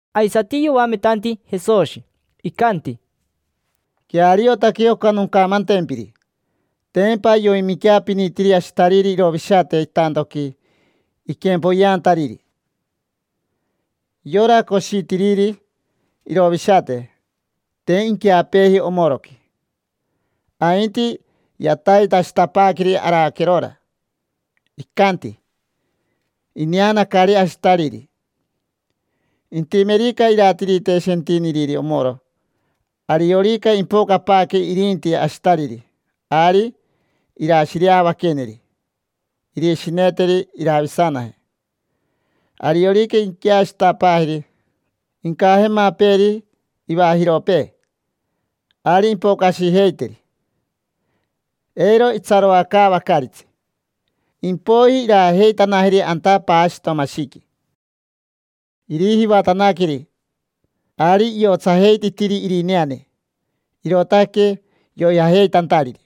Aisati yoametanti Jesoshi, icanti: —Queariotaque oca noncamantempiri. Tempa yoiminqueapinitiri ashitariri irovishate itantoqui iquempoyeantariri. Yora coshitiriri irovishate, te inqueapeeji omoroqui, ainti yataitashitapaaqueri araquerora. Icanti: “Ineanacari ashitariri”. Intimerica iratirite shentiniriri omoro, ariorica impocapaaque irinti ashitariri, ari irashireavaqueneri, irishineteri iravisanaje. Ariorica inqueashitapaajeri, incajemapeeri ivajiropee, ari impocashijeiteri, eiro itsaroacaavacaritsi. Impoiji iraajeitanajeri anta paashitomashiqui, irijivatanaqueri. Ari iotsajeititiri irineane, irootaque yoijajeitantariri.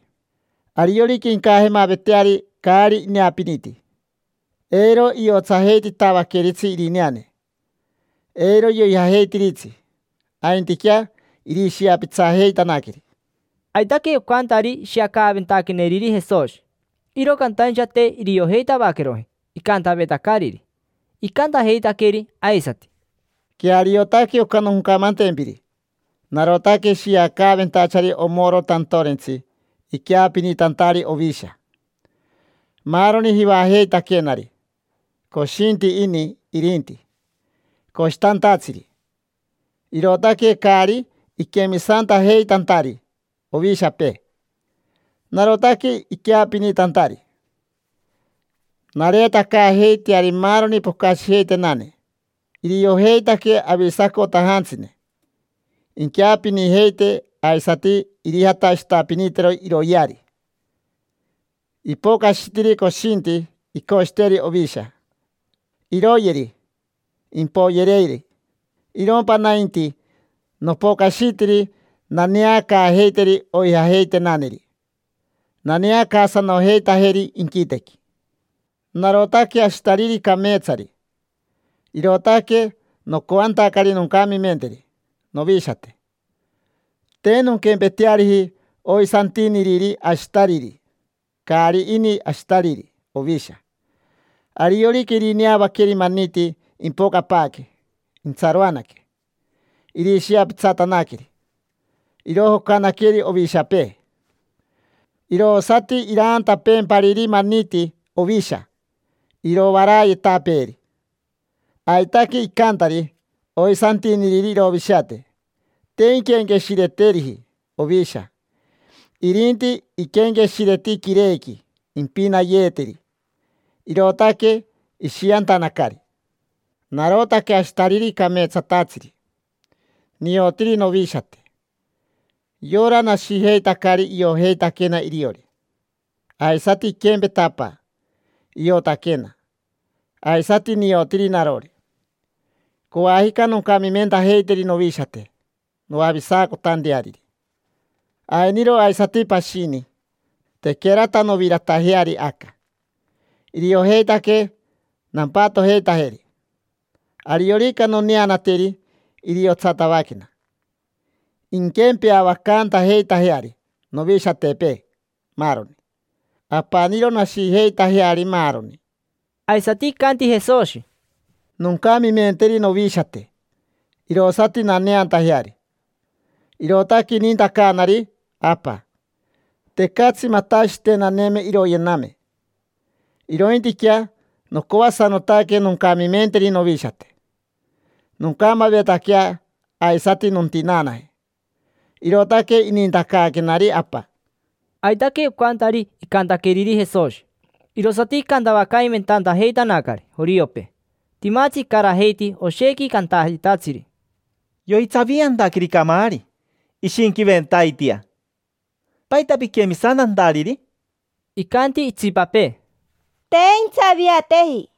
Ariorica incajamaveteari caari ineapiniti, eiro iotsajeititavaqueritsi irineane. Eiro yoijajeitiritsi, aintiquea irishiapitsajeitanaqueri. Aitaque ocantari ishiacaaventaqueneriri Jesoshi, iro cantaincha te iriojeitavaqueroji icantavetacariri. Icantajeitaqueri aisati: —Queariotaque oca noncamantempiri. Narotaque shiacaventachari omoro tantorentsi iqueapinitantari ovisha. Maaroni jivajeitaquenari, coshinti ini irinti, coshitantatsiri; irootaque caari iquemisantajeitantari ovishapee. Narotaque iqueapinitantari, nareetacaajeiteari maaroni pocashijeitenane. Iriojeitaque avisacotajantsine. Inqueapinijeite, aisati irijatashitapinitero iroyeari. Ipocashitiri coshinti icoshiteri ovisha, iroyeri, impoyereeri. Irompa nainti, nopocashitiri naneacaajeiteri oijajeitenaneri, naneacaasanojeitajeri inquitequi. Narotaque ashitariri cameetsari, irootaque nocoantacari noncamimenteri novishate. Te nonquempeteariji oisantiniriri ashitariri. Caari ini ashitariri ovisha. Ariorica irineavaqueri maniti impocapaaque, intsaroanaque, irishiapitsatanaqueri; irojocanaqueri ovishapee. Irosati iraantapeempariri maniti ovisha, irovarayetapeeri. Aitaque icantari oisantiniriri irovishate. Te inquenqueshireteriji ovisha, irinti iquenqueshireti quirequi impinayeeteri, irootaque ishiantanacari. Narotaque ashitariri cameetsatatsiri. Niotiri novishate. Yora nashijeitacari iojeitaquena iriori. Aisati iquempeta Apa, iotaquena; aisati niotiri narori. Coajica noncamimentajeiteri novishate noavisacotanteariri. Ainiro aisati pashini, tequerata noviratajeari aca. Iriojeitaque nampatojeitajeri. Ariorica noneanateri iriotsatavaquena, inquempeavacantajeitajeari novishatepee maaroni. Apaniro nashijeitajeari maaroni. Aisati icanti Jesoshi: —Noncamimenteri novishate, irosati naneantajeari. Irootaque inintacaanari Apa. Tecatsi matashitenaneme iroyename, irointiquea nocoasanotaque noncamimenteri novishate. Noncamavetaquea, aisati nontinaanaje: irootaque inintacaaquenari Apa. Aitaque ocantari icantaqueriri Jesoshi. Irosati icantavacaimentajeitanacari joriopee. Timatsi icarajeiti oshequi cantayetatsiri: —Yoitsaviantaqueri camaari. Ishinquiventaitia. ¿Paita piquemisantantariri? Icanti itsipapee: —Te intsaviateji: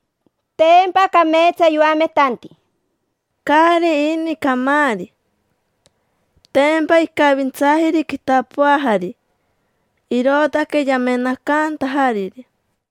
tempa cameetsa yoametanti. Caari ini camaari: tempa icavintsaajiri quitapoajari, irootaque yamenacantajariri.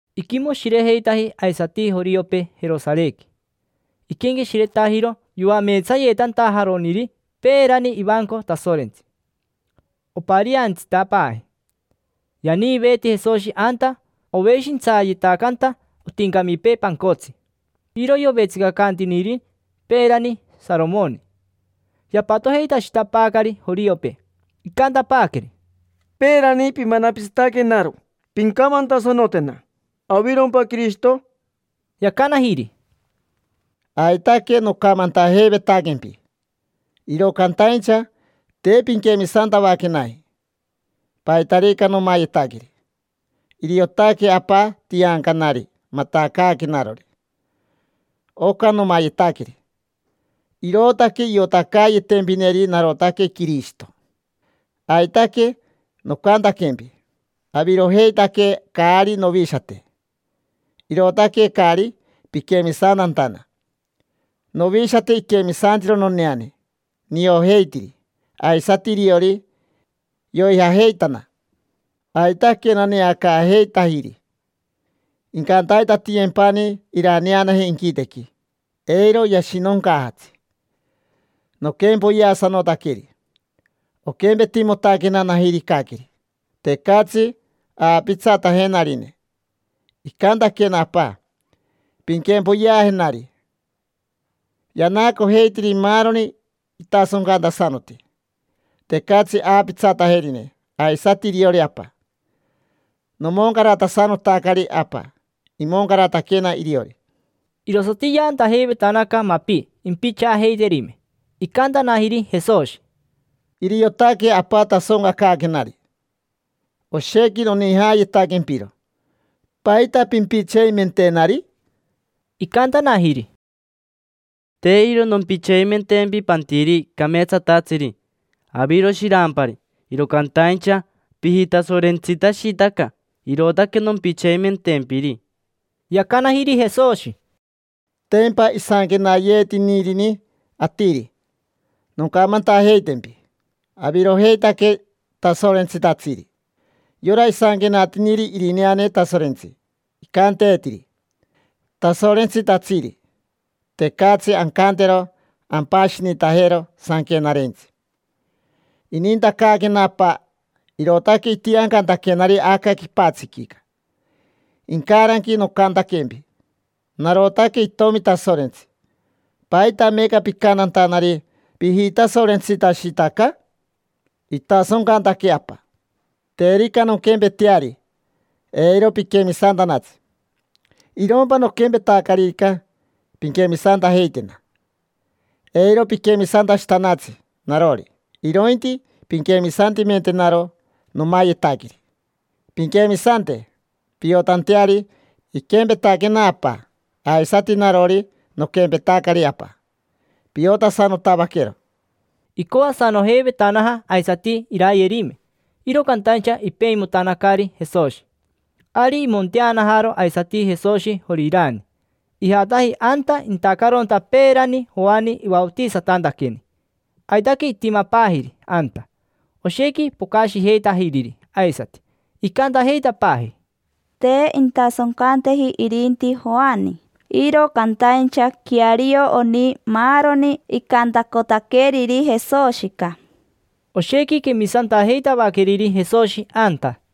Iquimoshirejeitaji aisati joriopee Jerosarequi. Iquenqueshiretajiro yoameetsayeetantajaroniri peerani ivanco Tasorentsi. Opariantsitapaaji. Yaniiveeti Jesoshi anta oveshintsayetacanta otincamipee pancotsi. Iro yovetsicacantiniri peerani Saromoni. Yapatojeitashitapaacari joriopee. Icantapaaqueri: —Peerani pimanapitsataquenaro. Pincamantasanotena: ¿avirompa Quirishito? Yacanajiri: —Aitaque nocamantajeivetaquempi. Iro cantaincha te pinquemisantavaquenaji. Paitarica nomayetaqueri, iriotaque Apa tiancanari matacaaquenarori. Oca nomayetaqueri, irootaque iotacayetempineri narotaque Quirishito. Aitaque nocantaquempi: “Avirojeitaque caari novishate, irootaque caari piquemisantantana”. Novishate iquemisantiro noneane. Niojeitiri, aisati iriori, yoijajeitana. Aitaque naneacaajeitajiri. Incantaitatiyempani iraneanaje inquitequi. Eiro yashinoncaajatsi. Noquempoyeasanotaqueri, oquempetimotaquena najiricaqueri. Tecatsi aapitsatajenarine. Icantaquena Apa: “Pinquempoyeajenari”. Yanaacojeitiri maaroni itasoncantasanoti, tecatsi aapitsatajerine aisati iriori Apa. Nomoncaratasanotacari Apa, imoncarataquena iriori. Irosati yaantajeivetanaca mapi impichaajeiterime. Icantanajiri Jesoshi: —Iriotaque Apa tasoncacaaquenari. Oshequi nonijayetaquempiro. ¿Paita pimpitseimentenari? Icantanajiri: —Te iro nompitseimentempi pantiri cameetsatatsiri. Aviro shirampari, iro cantaincha pijitasorentsitashitaca, irootaque nompitseimentempiri. Yacanajiri Jesoshi: —Tempa isanquenayeetinirini atiri: “Noncamantajeitempi: ‘Avirojeitaque tasorentsitatsiri’”. Yora isanquenatiniri irineane Tasorentsi, icanteetiri: “Tasorentsitatsiri”. Tecatsi ancantero ampashinitajero Sanquenarentsi. Inintacaaquena Apa, irootaque itiancantaquenari aca quipatsiquica. Incaranqui nocantaquempi: “Narotaque Itomi Tasorentsi”. ¿Paita meeca picantantanari: “Pijitasorentsitashitaca”? Itasoncantaque Apa. Terica nonquempeteari eiro piquemisantanatsi. Irompa noquempetacaririca, pinquemisantajeitena. Eiro piquemisantashitanatsi narori, irointi pinquemisantimentenaro nomayetaqueri. Pinquemisante, piotanteari iquempetaquena Apa. Aisati narori noquempetacari Apa. Piotasanotavaquero. Icoasanojeivetanaja aisati irayerime, iro cantaincha ipeimotanacari Jesoshi. Ari imonteanajaro aisati Jesoshi Jorirani. Ijataji anta intacaronta peerani Joani ivaotisatantaqueni. Aitaque itimapaajiri anta. Oshequi pocashijeitajiriri aisati. Icantajeitapaaji: —Te intasoncanteji irinti Joani, iro cantaincha queario oni maaroni icantacotaqueriri Jesoshica. Oshequi quemisantajeitavaqueriri Jesoshi anta.